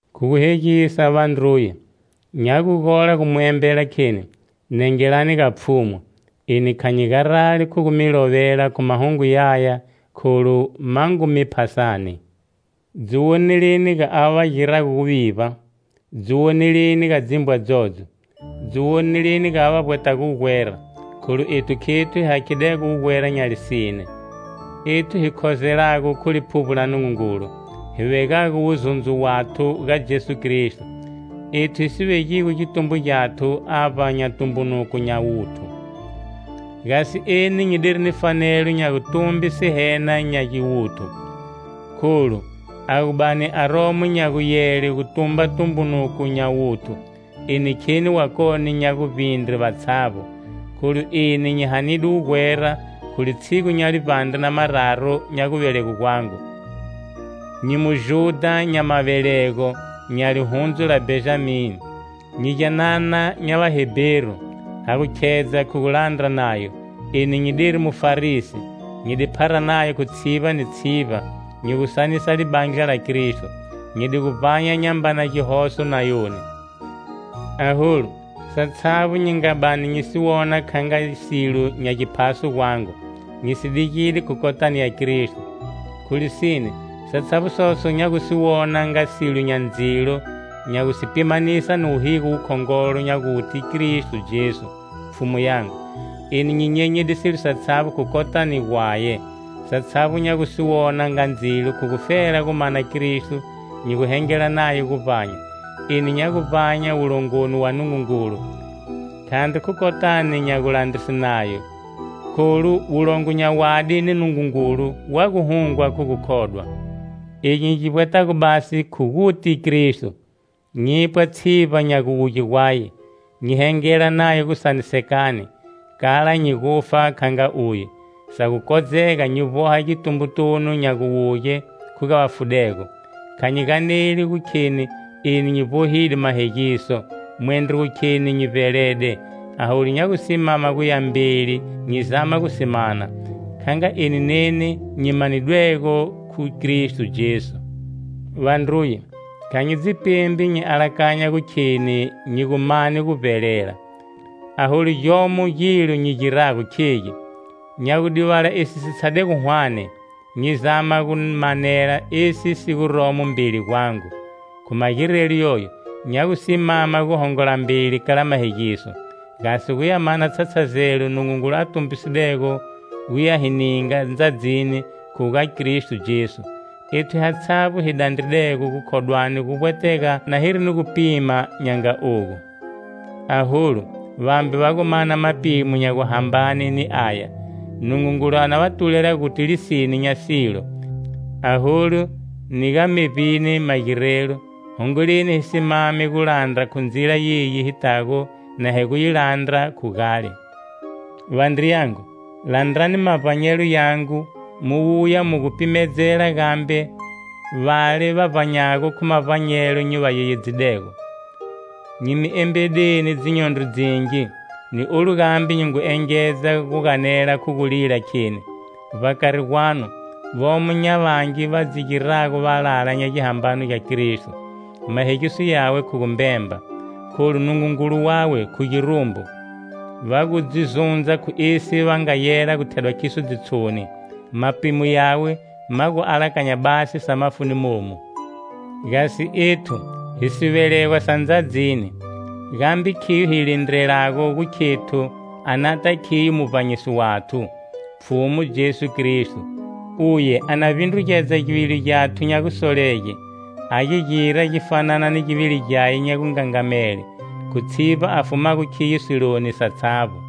Khu guhegisa, vandruye, nya gu gola gu mi embela kheni: Nengelani ga Pfhumu! Eni kha nyi garali khu gu mi lovela khu mahungu yaya kholu ma ngu mi phasani. Dzi woneleni ga ava va girago guvivba, dzi woneleni ga dzimbwa dzodzo, dzi woneleni ga ava va vbwetago wugwera. Kholu ethu khethu hi hakhidego wugwera nya lisine, ethu hi khozelago khu Liphuvbo la Nungungulu, hi vegago wuzundzo wathu ga Jesu Kristo, ethu hi si vegigo gitumbo gyathu avba nya tumbunuko nya wuthu. Gasi eni nyi diri ni fanelo nya gutumbe sihena nya giwuthu. Kholu, a gu bani aromo nya guyele gu tumba tumbunuko nya wuthu, eni kheni wakone nya guvbindre vatshavbo: Kholu eni nyi hanide wugwera khu litshigu nya livbandre na mararu nya guvelegwe gwangu; nyi Mujudha nya mavelego nya lihundzu la Bhenjami; nyi gyanana nya Vaheberu. Ha gu khedza khu gulandra Nayo, eni nyi diri Mufarisi; nyi di phara Nayo khu tshivba ni tshivba, nyi gu sanisa Libandla la Kristo. Nyi di gu vbanya nyambana gihoso nayoni. Aholu, satshavbo nyi nga bani nyi si wona kha nga silo nya giphaso gwangu, nyi si digide khu kotani ya Kristo. Khu lisine, satshavbo soso nya gu si wona nga silo nya ndzilo nya gu si pimanisa ni wuhigo wukhongolo nya guti Kristo Jesu, Pfhumu yangu. Eni nyi nyenyide silo satshavbo khu kotani gwaye. Satshavbo nya gu si wona nga ndzilo khu gufela gu mana Kristo nyi gu hengela naye guvbanya. Eni nya gu vbanya wulongoni gwa Nungungulu, khandri khu kotani nya gulandrise Nayo, kholu wolongo nya wadi ni Nungungulu wa gu hungwa khu gukhodwa. Egi nyi gi vbwetago basi khu guti Kristo, nyipwa tshivba nya guwuge gwaye, nyi hengela naye gusanisekani, kala nyi gufa kha nga uye, sa gu kodzega nyi vboha gitumbotunu nya guwuge khu ga vafudego. Kha nyi ganeli gu kheni eni nyi vbohide mahegiso, mwendro gu kheni nyi vbelede, aholu nya gu simama guya mbeli nyi zama gu si mana, kha nga eni neni nyi manidwego khu Kristo Jesu. Vandruye, kha nyi dzi pembi nyi alakanya gu kheni nyi gu mane guvbelela, aholu gyomo gilo nyi girago, khegi: nya gu divala esi si tshadego hwane, nyi zama gu manela esi si guromo mbeli gwangu. Khu magirelo yoyo, nya gu simama gu hongola mbeli kala mahegiso, gasi gu ya mana tshatshazelo Nungungulu a tumbisidego gu ya hi ninga ndzadzini khu ga Kristo Jesu. Ethu hatshavbo hi dandridego gukhodwani, guvbwetega na hiri ni gupima nya nga ogu. Aholu vambe va gu mana mapimo nya guhambane ni aya, Nungungulu a na va tulela guti lisine nya silo. Aholu, ni ga mevbini magirelo, hongoleni hi simame gulandra khu ndzila yeyi hi tago na hi gu yi landra khu gale. Vandriyangu, landrani mavbanyelo yangu mu wuya mu gu pimedzela gambe vale va vbanyago khu mavbanyelo nyi va yeyedzidego. Nyi mi embedeni dzinyondro dzingi, ni olu gambe nyi ngu engedza gu ganela khu gulila kheni, vbakari gwanu vomo nya vangi va dzi girago valala nya gihambano gya Kristo. Mahegiso yawe khu gumbemba, kholu Nungungulu wawe khu girumbu. Va gu dzi zundza khu esi va nga yela gu thedwa khiso ndzitshoni, mapimo yawe ma gu alakanya basi sa mafuni monu. Gasi ethu, hi sivelegwa sa ndzadzini, gambe khiyo hi lindrelago gu khethu a nata khiyo Muvbanyisi wathu, Pfhumu Jesu Kristo. Uye a na vbindrugedza givili gyathu nya gusolege a gi gira gi fanana ni givili gyaye nya gungangamele, khu tshivba a fumago khiyo siloni satshavbo.